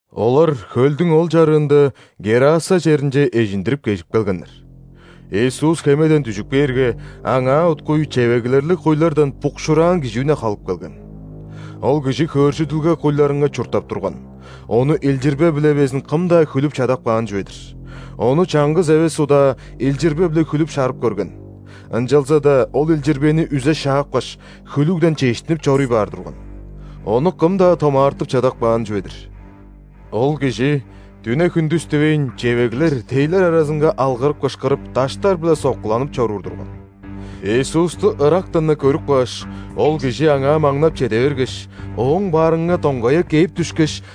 Олар хөлдүң ол чарыында Гераса черинче эжиндирип кежип келгеннер. Иисус хемеден дүжүп кээрге, Аңаа уткуй чевеглерлиг куйлардан букшуураан кижи үне халып келген. Ол кижи хөөржүдүлге куйларынга чурттап турган, ону илчирбе-биле безин кым-даа хүлүп чадап каан чүве-дир. Ону чаңгыс эвес удаа илчирбе-биле хүлүп-шарып көрген, ынчалза-даа ол илчирбени үзе шаапкаш, хүлүгден чештинип чоруй баар турган. Ону кым-даа томаартып чадап каан чүве-дир. Ол кижи дүне-хүндүс дивейн, чевеглер, тейлер аразынга алгырып-кышкырып, даштар-биле соккуланып чоруур турган. Иисусту ырактан-на көрүп кааш, ол кижи Аңаа маңнап чеде бергеш, Ооң баарынга доңгая кээп дүшкеш,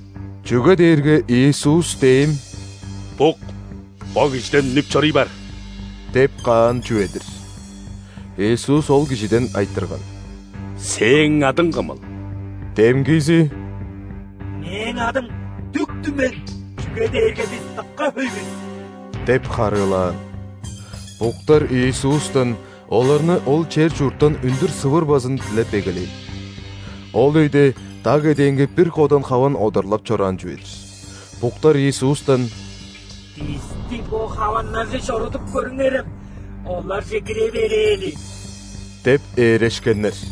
Чүге дээрге Иисус дем: «Бук, бо кижиден үнүп чоруй бар!» – деп каан чүве-дир. Иисус ол кижиден айтырган: «Сээң адың кымыл?» Демгизи: «Мээң адым Дүк-түмен, чүге дээрге бис дыка хөй бис» – деп харыылаан. Буктар Иисустан оларны ол чер-чурттан үндүр сывырбазын дилеп эгелээн. Ол өйде даг эдээнге бир кодан хаван одарлап чораан чүве-дир. Буктар Иисустан: «Бисти бо хаваннарже чорудуп көрүңерем, оларже кире берээли» – деп ээрешкеннер.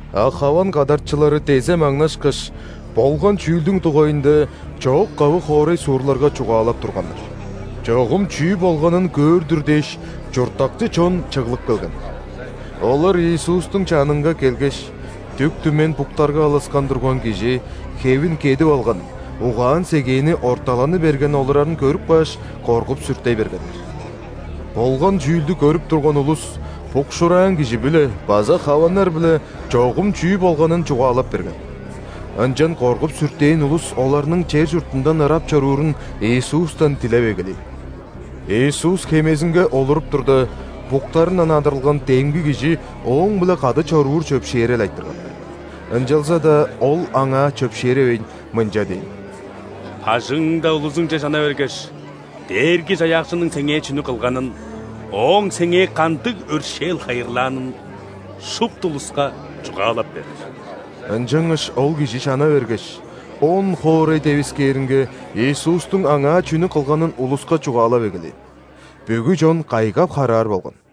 А хаван кадарчылары дезе маңнашкаш, болган чүүлдүң дугайында чоок-кавы хоорай-суурларга чугаалап турганнар. Чогум чүү болганын көөр-дүр дээш, чурттакчы чон чыглып келген. Олар Иисустуң чанынга келгеш, дүк-түмен буктарга алыскан турган кижи хевин кедип алган, угаан-сегээни орталаны берген олурарын көрүп кааш, коргуп-сүртей бергеннер. Болган чүүлдү көрүп турган улус букшуураан кижи-биле база хаваннар-биле чогум чүү болганын чугаалап берген. Ынчан коргуп-сүртээн улус оларның чер-чуртундан ырап чоруурун Иисустан дилеп эгелээн. Иисус хемезинге олуруп турда, буктарындан адырылган демги кижи Ооң-биле кады чоруур чөпшээрел айтырган. Ынчалза-даа Ол аңаа чөпшээревейн, мынча дээн: «Бажыңыңда улузуңче чана бергеш, Дээрги-Чаяакчының сеңээ чүнү кылганын, Ооң сеңээ кандыг өршээл хайырлаанын шупту улуска чугаалап бер». Ынчангаш ол кижи чана бергеш, ·Он-хоорай девискээринге Иисустуң аңаа чүнү кылганын улуска чугаалап эгелээн. Бүгү чон кайгап-хараар болган.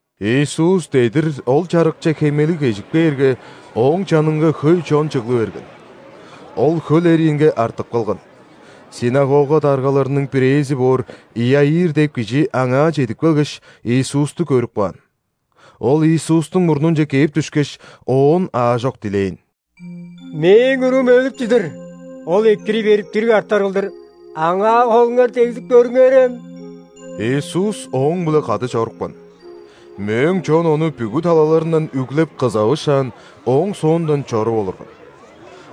Иисус дедир ол чарыкче хемелиг кежип кээрге, Ооң чанынга хөй чон чыглы берген. Ол хөл эриинге артып калган. Синагога даргаларының бирээзи боор Иаир деп кижи аңаа чедип келгеш, Иисусту көрүп каан. Ол Иисустуң мурнунче кээп дүшкеш, Оон аажок дилээн: «Мээң уруум өлүп чыдыр, ол экирий берип, дириг артар кылдыр, аңаа холуңар дегзип көрүңерем!» Иисус ооң-биле кады чорупкан. Мөөң чон Ону бүгү талаларындан үглеп, кызавышаан, Ооң соондан чоруп олурган.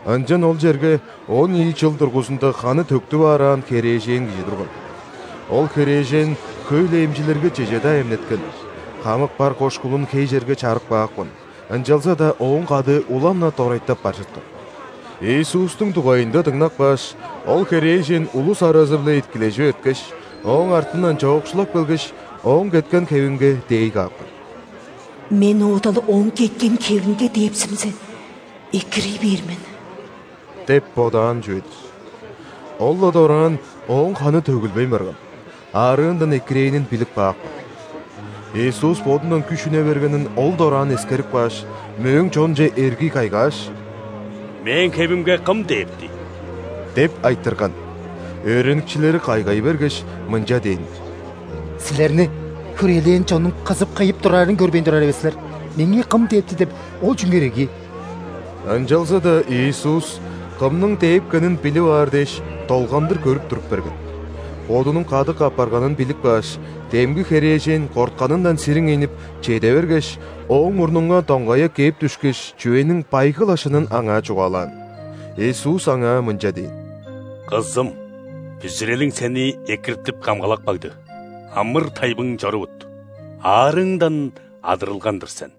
Ынчан ол черге он ийи чыл дургузунда ханы төктүп аараан херээжен кижи турган. Ол херээжен хөй-ле эмчилерге чеже-даа эмнеткен, хамык бар кошкулун хей черге чарып каапкан, ынчалза-даа ооң кадыы улам-на дорайтап бар чыткан. Иисустуң дугайында дыңнап кааш, ол херээжен улус аразы-биле иткилежип эрткеш, Ооң артындан чоокшулап келгеш, Ооң кеткен хевинге дээй каапкан. «Мен оода-ла Ооң кеткен хевинге дээпсимзе, экирий бээр мен» деп бодаан чүве-дир. Ол-ла дораан ооң ханы төгүлбейн барган, аарыындан экирээнин билип каапкан. Иисус Бодундан күш үне бергенин ол дораан эскерип кааш, мөөң чонче эргий кайгааш: «Мээң хевимге кым дээпти?» – деп айтырган. Өөреникчилери кайгай бергеш, мынча дээннер: «Силерни хүрээлээн чоннуң кызып-кыйып турарын көрбейн турар эвес силер, „Меңээ кым дээпти?“ – деп ол чүңер ирги?» Ынчалза-даа Иисус кымның дээпкенин билип аар дээш, долгандыр көрүп туруп берген. Бодунуң кадык апарганын билип кааш, демги херээжен кортканындан сириңейнип, чеде бергеш, Ооң мурнунга доңгая кээп дүшкеш, чүвениң байгы-ла шынын Аңаа чугаалаан. Иисус аңаа мынча дээн: «Кызым, бүзүрелиң сени экиртип-камгалап кагды, амыр-тайбың чорувут, аарыыңдан адырылган-дыр сен».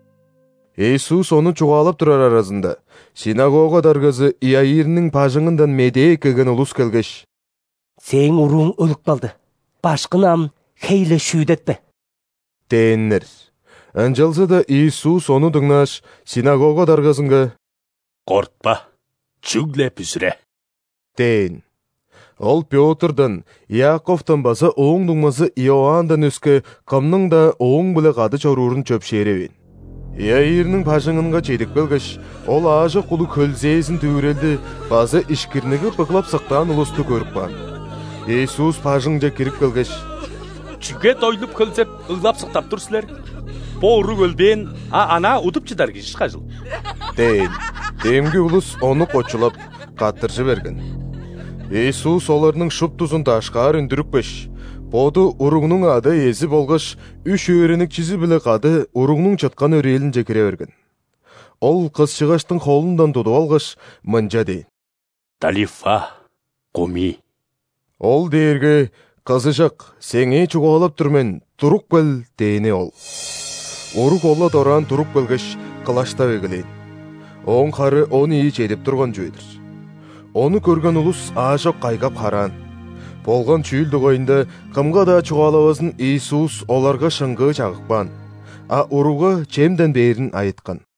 Иисус ону чугаалап турар аразында, ·синагога даргазы Иаирниң бажыңындан медээ эккелген улус келгеш: «Сээң урууң өлүп калды. Башкыны ам хей-ле шүүдетпе» – дээннер. Ынчалза-даа Иисус ону дыңнааш, синагога даргазынга: «Кортпа, чүгле бүзүре!» – дээн. Ол Пётрдан, Иаковтан база ооң дуңмазы Иоанндан өске кымның-даа Ооң-биле кады чоруурун чөпшээревээн. Иаирниң бажыңынга чедип келгеш, Ол аажок улуг хөлзээзин-дүвүрелди база ишкирнигип ыглап-сыктаан улусту көрүп каан. Иисус бажыңче кирип келгеш: «Чүге дойлуп-хөлзеп, ыглап-сыктап тур силер? Бо уруг өлбээн, а анаа удуп чыдар кижи ышкажыл» – дээн. Демги улус Ону кочулап, каттыржы берген. Иисус оларның шуптузун дашкаар үндүрүпкеш, Боду уругнуң ада-иези болгаш үш өөреникчизи-биле кады уругнуң чыткан өрээлинче кире берген. Ол кысчыгаштың холундан тудуп алгаш, мынча дээн: «Талифа, куми!» (ол дээрге: «Кызыжак, сеңээ чугаалап тур мен, туруп кел!» – дээни ол). Уруг ол-ла дораан туруп келгеш, кылаштап эгелээн (ооң хары он ийи чедип турган чүве-дир). Ону көрген улус аажок кайгап-хараан. Болган чүүл дугайында кымга-даа чугаалавазын Иисус оларга шыңгыы чагып каан, а уругга чемден бээрин айыткан.